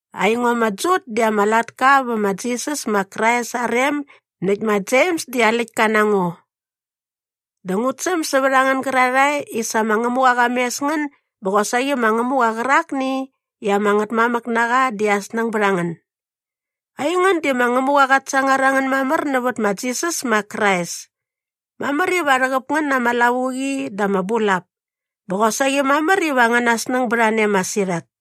Aingo ma Jut di ama latka vä ma Jisas ma Krais aa rem näkt ma Jems di aa läktka na ngo. Dä ngut säm sävät a ngän gärarhae i sa ma Ngämuqa qa mes ngän bä qosaqi ma Ngämuqa qärakni i ama Ngätmamäk na qa di aa snäng bät a ngän. Aingän di ma Ngämuqa qat sangar a ngän mamär nävät ma Jisas ma Krais. Mamär iva rhäqäp ngän na ama lavuqi dä ama bulap. Bä qosaqi mamär iva angäna snäng bät a ne masirhat.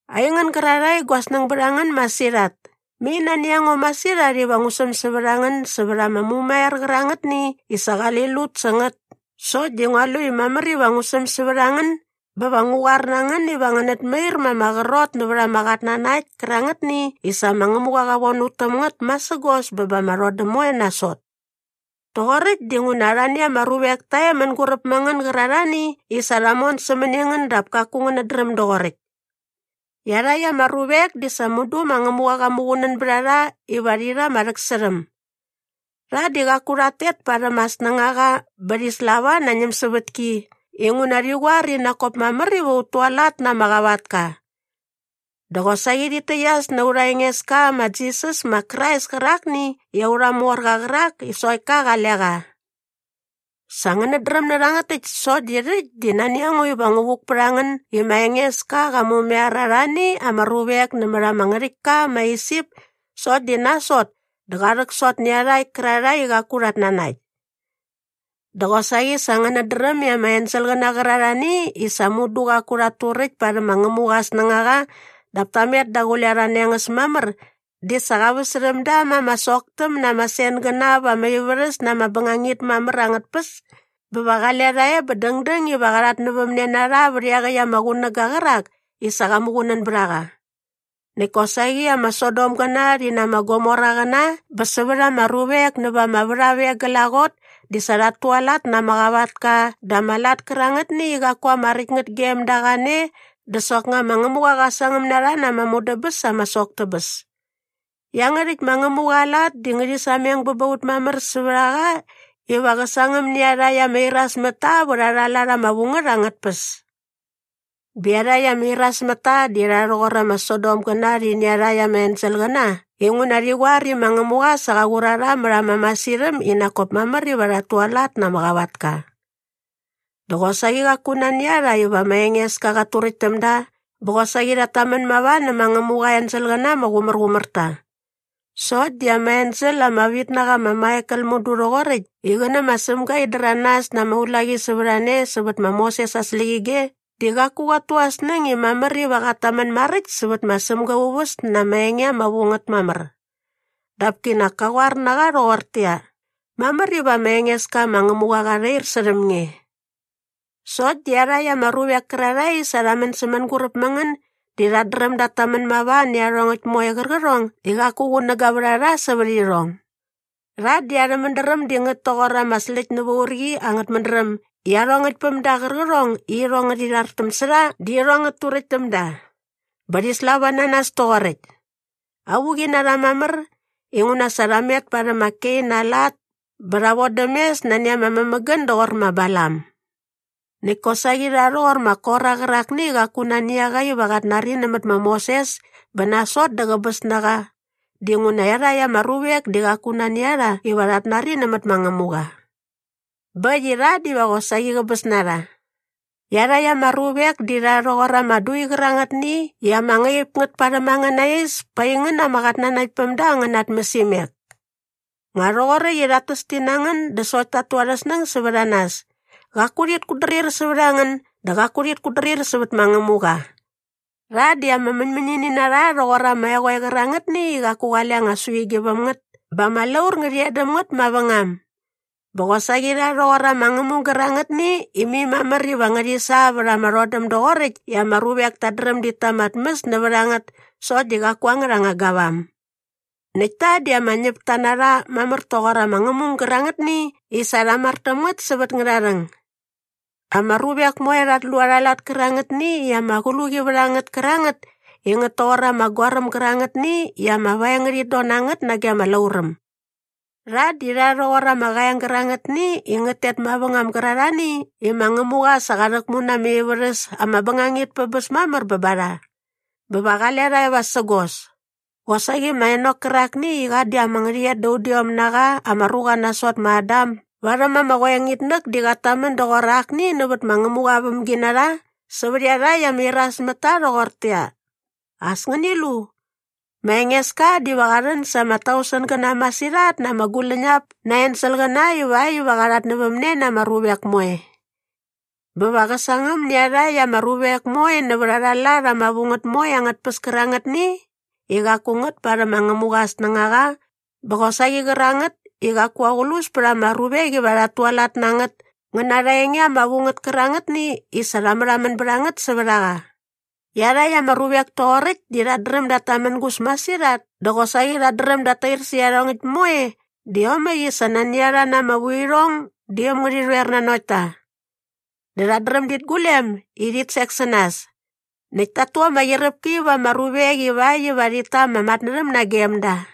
Aingän gärarhae i gua snäng bät a ngän masirhat, mai nani a ngo masirhat iva ngu säm sävät a ngän sävät ama mumaiar qärangätni i sa qali lut sä ngät sokt di ngua lu i mamär iva ngu säm sävät a ngän bä va ngu qoar na ngän iva ngänät mair ma ama qrot nävät ama qatnanakt kärangätni i sa ma Ngämuqa qa von ut täm ngät masägos bä ba ama rhodäm moe nasot. Rhoqoräkt dinguna arhani ama ruvek ta e mänguräp mä ngän gärarhani i sa rha mon sämäni ngän dap kaku ngänät dräm doqoräkt. Iarhakt ama ruvek di sa mudu ma Ngämuqa qa muqunän bät a rha iva rhi rha aa rhäksärhäm. Rha di qaku rhat tet parhäm aa snängaqa bä rhi slava na aa ñämsävätki inguna rhi qoar i nak kop mamär iva ut tualat na ama qavatka. Dä qosaqi rhit täqyas na aurha Engeska ma Jisas ma Krais kärakni i aurha morqa qärak i sokt ka qale qa. Sa ngänät dräm nä rhangät täkt sokt di rhäkt di nani a ngo iva ngu vuk pät a ngän i ma Engeska qa mumaiar arhani ama ruvek nämät ama ngärhäktka ma Isip sokt di nasot dä qa rhäksot nä iarhakt kärarhae i qaku rhat nanakt. Dä qosaqi sa ngänät dräm i ama enselqäna qärarhani i sa mudu qaku rhat turäkt parhäm ma Ngämuqa aa snängaqa dap ta met daqule arha nengäs mamär di sa qa väsärhäm da ma ama soktäm na ama sengäna va ama ivärhäs na ama bängangit mamär angät tpäs bä va qale rha e bä dängdäng iva qa rhatnävämne na rha vät iaqäkt ama qunäga qärak i sa qa muqunän bät a qa. Näkt kosaqi ama Sodomgäna rhi na ama Gomoraqäna bä sävät ama ruvek näva ama värhap e glaqot di sa rhat tualat na ama qavatka dä ama lat kärangätni i qaku ama räkt ngät gem da qane dä soknga ma Ngämuqa qa sangäm na rha na ama mudäbäs ama sok tä bäs. Iangärhäkt ma Ngämuqa aa lat di ngärhi sameng bä ba ut mamär sävät a qa iva qä sangäm nä iarhakt ama irasmätta vät arha lat ama vu ngät angät tpäs. Bä iarhakt ama irasmätta di rha rhoqor ama Sodomgäna rhi nä iarhakt ama enselqäna inguna rhi qoar i ma Ngämuqa sa qa qur a rha mät ama masirhäm i nak kop mamär iva rhat tualat na ama qavatka. Dä qosaqi qaku nani a rha iva ma Engeska qat turäkt täm da bä qosaqi rhat tamän mava nä ma Ngämuqa aa enselqäna ama qumärqumär ta. Sokt di ama ensel ama vit na qa ma Maikel mudu rhoqoräkt i qä nä ma Sämga in däranas na ama ulaqi sävät a ne sävät ma Moses aa släqyige di qaku qat tu aa snäng i mamär iva qat tamän maräkt sävät ma Sämga aa uväs na ama enge ama vu ngät mamär. Dap kinak ka qoar na qa rhoqortäqyia, “Mamär iva ma Engeska ma Ngämuqa qa rhair särhäm nge.” Sokt di iarhakt ama ruvek kärarhae i sa rha män sä mänguräp mä ngän di rhat dräm dat tamän mava nä iarhongäkt moe qärqärhong i qaku qunäga vät a rha sävät irhong. Rha di arhä mädräm di ngät toqor ama släkt nävä urqi angät mädräm i iarhongäkt päm da qärqärhong i irhong ngärhi rhartäm sä rha di irhong ngät turäkt täm da. Bä rhi slava na nas toqoräkt. Avuqi na rha mamär, inguna sa rha met parhäm ma Kein aa lat bä rha vodäm mes nani ama mämägän doqor ma Balam! Näkt kosaqi rha rhoqor ma Kora qärakni i qaku nani a qa iva qat nari nämät ma Moses bä nasot dä qäbäs na qa dinguna iarhakt ama ruvek di qaku nani a rha iva rhat nari nämät ma Ngämuqa. Bä äkt i rha diva qosaqi qäbäs na rha. Iarhakt ama ruvek di rha rhoqor ama dui qärangätni i ama ngaip ngät parhäm angäna is pa aingän ama qatnanaktpämda angän ama tmäsimek. Nga rhoqoräkt i rhat täs ti na ngän dä sokt tat tu arhä snäng sävät a nas. Qaku rhit kutdrir sävät a ngän dä qaku rhit kutdrir sävät ma Ngämuqa. Rha di ama mäñmäñini na rha rhoqor ama eqoe qärangätni i qaku qale anga suigi väm ngät bä ama laur ngärhi e däm ngät mavängam. Bä qosaqi rha rhoqor ama ngämung gärangätni i mai mamär iva ngärhi sa vät ama rhodäm doqoräkt i ama ruvek tat dräm dit ta ama tmäs nävät a ngät sokt di qaku angärha anga gavam. Näkt ta di ama ñäpta na rha mamär toqor ama ngämung gärangätni i sa rha mar täm ngät sävät ngärharhäng. Ama ruvek moe rhat lu arha lat kärangätni i ama qluqi vät a ngät kärangät i ngät toqor ama goaräm gärangätni i ama vaeng ngärhit don na ngät nage ama lauräm. Rha di rha rhoqor ama qaeng gärangätni i ngät tet mavängam gärarhani i ma Ngämuqa sa qa rhäkmu na ama ivärhäs ama bängangit pä bäs mamär bä ba rha. Bä va qale rha e vasägos. Qosaqi ma Enok kärakni i qa di ama ngärhäqyet da udiom na qa ama ruqa nasot ma Adam barhäm ama qoengitnäk di qat tamän doqor akni nävät ma Ngämuqa aa vämginarha sävät iarhakt ama irasmätta rhoqortäqyia, “As ngäni lu! Ma Engeska diva qa rhän sa ama tausengäna masirhat na ama guläñap na aa enselqäna ivakt iva qa rhatnävämne na ama ruvek moe. Bä va qä sangäm nä iarhakt ama ruvek moe nävät arha lat ama vu ngät moe angät tpäs kärangätni i qaku ngät parhäm ma Ngämuqa aa snängaqa bä qosaqi qärangät i qaku aqlus pät ama ruvek iva rhat tualat na ngät ngä na arha enge ama vu ngät kärangätni i sa rha märhamän bät a ngät sävät a qa.” Iarhakt ama ruvek toqoräkt di rhat dräm dat tamängus masirhat dä qosaqi rhat dräm dat tair särhä iarhongäkt moe dä iomäkt i sa nani a rha na ama vuirhong di äm ngärhi rhoer nanokt ta. Dä rhat dräm dit gulem i rhit sek sä nas. Näkt tat tu ama qyiräpki va ama ruvek ivakt iva rhit ta ama matnärhäm nagem da.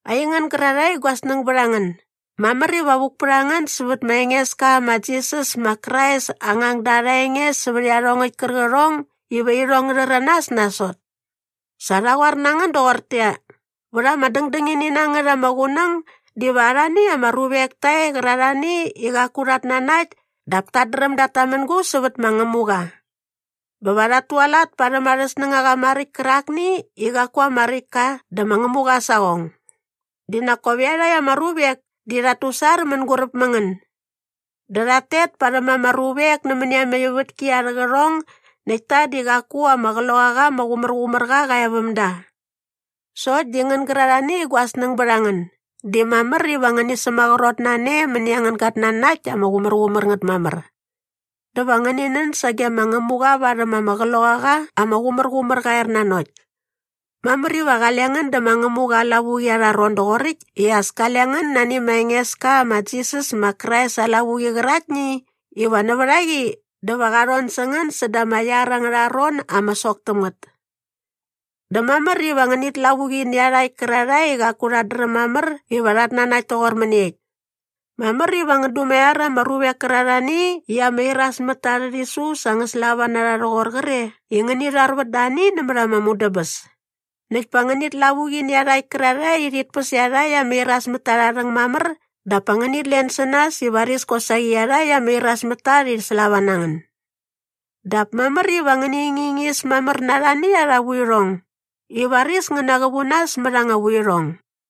Aingän gärarhae i gua snäng bät a ngän, mamär iva vuk pät a ngän sävät ma Engeska ma Jisas ma Krais aa ngangda arha enge sävät iarhongäkt kärqärhong iva irhong ngä rhäranas nasot. Sa rha qoar na ngän doqortäqyia, “Vät ama dängdängini na ngät ama qunäng diva arhani ama ruvek ta e qärarhani i qaku rhat nanakt dap tat dräm dat tamängus sävät ma Ngämuqa. Bä va rhat tualat parhäm arhä snängaqa maräkt kärakni i qaku ama räkt ka dä ma Ngämuqa aa saqong.” Di nak kop iarhakt ama ruvek di rhat tusar mänguräp mä ngän. Dä rhat tet parhäm ama ruvek nämäni ama ivätki arhä qärhong näkt ta di qaku ama Qloqaqa ama Qumärqumärqa qa e väm da. Sokt di ngän gärarhani i gua snäng bät a ngän, di mamär iva ngäni sämaqrot na ne mäni angän gatnanakt ama qumärqumär ngät mamär. Dä va ngäni nän sage ma Ngämuqa varhäm ama Qloqaqa ama Qumärqumärqa aa ernanokt. Mamär iva qale ngän dä ma Ngämuqa aa lavuqi arha ron doqoräkt i as kale ngän nani ma Engeska ma Jisas ma Krais aa lavuqi qäraktni iva nävät a qi dä va qa rhon sä ngän säda ama iar angärha ron ama sok täm ngät. Dä mamär iva ngänit lavuqi nä iarhakt kärarhae i qaku rhat dräm mamär iva rhat nanakt toqor mäniekt. Mamär iva ngän dumaiar ama ruvek kärarhani i ama iras mät ta arhä rhisu sa ngä slava na rha rhoqor qre i ngäni rharvät da ani nämät ama mudäbäs. Näkt pa ngänit lavuqi nä iarhakt kärarhae i rhit päs iarhakt ama irasmätta arha rhäng mamär dap pa ngänit len sä nas i varis kosaqi iarhakt ama irasmätta rhi slava na ngän. Dap mamär iva ngäni ngingis mamär na arhani arha vuirhong i varis ngän naqävu nas mät anga vuirhong.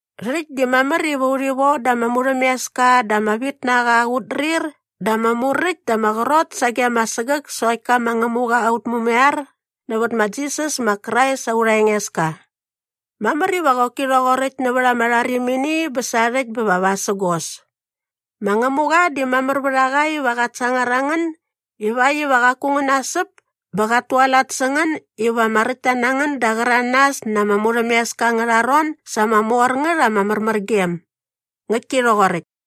Rhäkt di mamär iva urhi von da ama murhämeska dä ama vitnaqa aa qutdrir dä ama muräkt dä ama qrot sage ama sägäk sokt ka ma Ngämuqa aut Mumaiar nävät ma Jisas ma Krais aurha Engeska. Mamär iva qoki rhoqoräkt nävät ama rharimini bä sarhäkt bä va vasägos. Ma Ngämuqa di mamär vät a qa iva qat sangar a ngän ivakt iva qaku ngän nasäp bä qat tualat sä ngän iva ama räktta na ngän da aa qäranas na ama murhämeska angärha ron sa ama mor ngät ama märmärgem. Ngäktki rhoqoräkt.